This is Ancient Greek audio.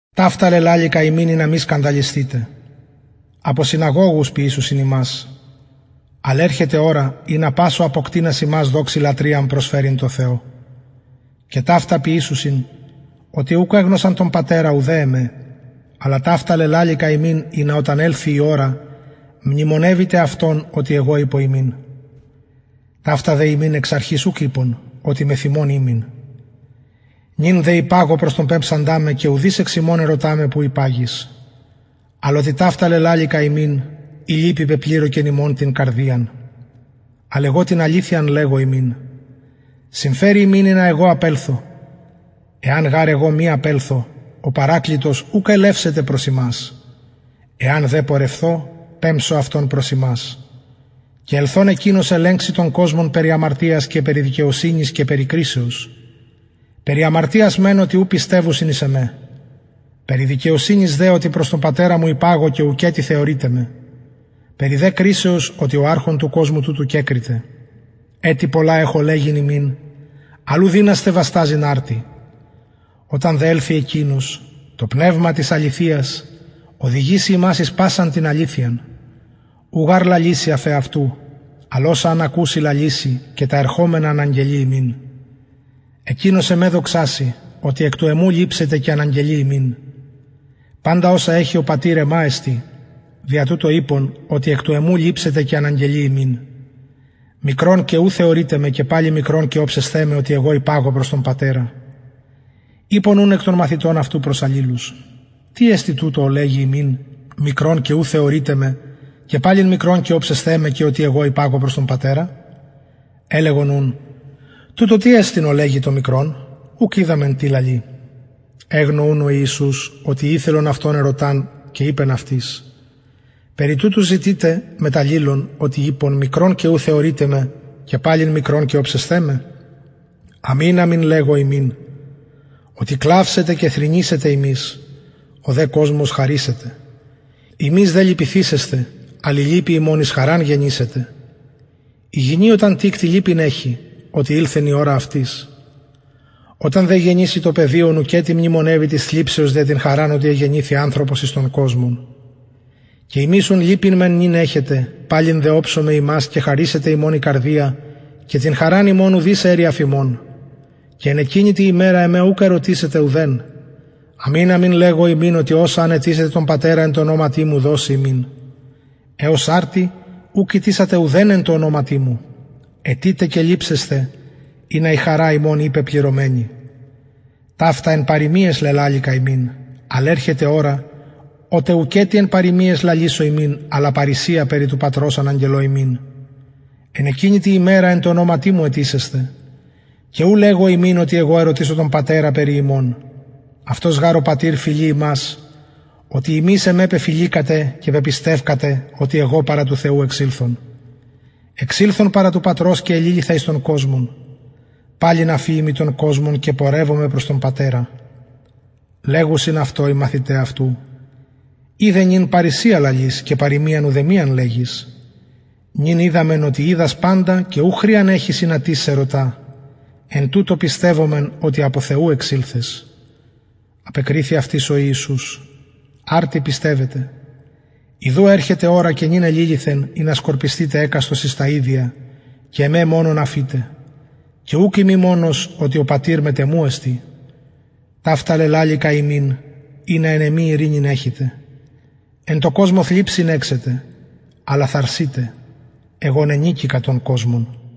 ταυτα λελαληκα υμιν ινα μη σκανδαλισθητε αποσυναγωγους ποιησουσιν υμας αλλ ερχεται ωρα ινα πας ο αποκτεινας υμας δοξη λατρειαν προσφερειν τω θεω και ταυτα ποιησουσιν οτι ουκ εγνωσαν τον πατερα ουδε εμε αλλα ταυτα λελαληκα υμιν ινα οταν ελθη η ωρα μνημονευητε αυτων οτι εγω ειπον υμιν ταυτα δε υμιν εξ αρχης ουκ ειπον οτι μεθ υμων ημην νυν δε υπαγω προς τον πεμψαντα με και ουδεις εξ υμων ερωτα με που υπαγεις αλλ οτι ταυτα λελαληκα υμιν η λυπη πεπληρωκεν υμων την καρδιαν αλλ εγω την αληθειαν λεγω υμιν συμφερει υμιν ινα εγω απελθω εαν γαρ εγω μη απελθω ο παρακλητος ουκ ελευσεται προς υμας εαν δε πορευθω πεμψω αυτον προς υμας και ελθων εκεινος ελεγξει τον κοσμον περι αμαρτιας και περι δικαιοσυνης και περι κρισεως περι αμαρτιας μεν οτι ου πιστευουσιν εις εμε περι δικαιοσυνης δε οτι προς τον πατερα μου υπαγω και ουκετι θεωρειτε με περι δε κρισεως οτι ο αρχων του κοσμου τουτου κεκριται ετι πολλα εχω λεγειν υμιν αλλ ου δυνασθε βασταζειν αρτι οταν δε ελθη εκεινος το πνευμα της αληθειας οδηγησει υμας εις πασαν την αληθειαν ου γαρ λαλησει αφ εαυτου αλλ οσα αν ακουση λαλησει και τα ερχομενα αναγγελει υμιν εκεινος εμε δοξασει οτι εκ του εμου ληψεται και αναγγελει υμιν παντα οσα εχει ο πατηρ εμα εστιν δια τουτο ειπον οτι εκ του εμου λαμβανει και αναγγελει υμιν μικρον και ου θεωρειτε με και παλιν μικρον και οψεσθε με οτι υπαγω προς τον πατερα ειπον ουν εκ των μαθητων αυτου προς αλληλους τι εστιν τουτο ο λεγει ημιν μικρον και ου θεωρειτε με και παλιν μικρον και οψεσθε με και οτι εγω υπαγω προς τον πατερα ελεγον ουν τουτο τι εστιν ο λεγει το μικρον ουκ οιδαμεν τι λαλει εγνω ουν ο ιησους οτι ηθελον αυτον ερωταν και ειπεν αυτοις περι τουτου ζητειτε μετ αλληλων οτι ειπον μικρον και ου θεωρειτε με και παλιν μικρον και οψεσθε με αμην αμην λεγω υμιν οτι κλαυσετε και θρηνησετε υμεις ο δε κοσμος χαρησεται υμεις δε λυπηθησεσθε αλλ η λυπη υμων εις χαραν γενησεται η γυνη οταν τικτη λυπην εχει οτι ηλθεν η ωρα αυτης οταν δε γεννηση το παιδιον ουκετι μνημονευει της θλιψεως δια την χαραν οτι εγεννηθη ανθρωπος εις τον κοσμον και υμεις ουν λυπην μεν νυν εχετε παλιν δε οψομαι υμας και χαρησεται υμων η καρδια και την χαραν υμων ουδεις αιρει αφ υμων και εν εκεινη τη ημερα εμε ουκ ερωτησετε ουδεν αμην αμην λεγω υμιν οτι οσα αν αιτησητε τον πατερα εν τω ονοματι μου δωσει υμιν εως αρτι ουκ ητησατε ουδεν εν τω ονοματι μου αιτειτε και ληψεσθε ινα η χαρα υμων η πεπληρωμενη ταυτα εν παροιμιαις λελαληκα υμιν αλλ ερχεται ωρα οτε ουκετι εν παροιμιαις λαλησω υμιν αλλα παρρησια περι του πατρος αναγγελω υμιν εν εκεινη τη ημερα εν τω ονοματι μου αιτησεσθε και ου λεγω υμιν οτι εγω ερωτησω τον πατερα περι υμων αυτος γαρ ο πατηρ φιλει υμας οτι υμεις εμε πεφιληκατε και πεπιστευκατε οτι εγω παρα του θεου εξηλθον εξηλθον παρα του πατρος και εληλυθα εις τον κοσμον παλιν αφιημι τον κοσμον και πορευομαι προς τον πατερα λεγουσιν αυτω οι μαθηται αυτου ιδε νυν παρρησια λαλεις και παροιμιαν ουδεμιαν λεγεις νυν οιδαμεν οτι οιδας παντα και ου χρειαν εχεις ινα τις σε ερωτα εν τουτω πιστευομεν οτι απο θεου εξηλθες απεκριθη αυτοις ο ιησους αρτι πιστευετε ιδου ερχεται ωρα και νυν εληλυθεν ινα σκορπισθητε εκαστος εις τα ιδια και εμε μονον αφητε και ουκ ειμι μονος οτι ο πατηρ μετ εμου εστιν ταυτα λελαληκα υμιν ινα εν εμοι ειρηνην εχητε εν τω κοσμω θλιψιν εχετε αλλα θαρσειτε εγω νενικηκα τον κοσμον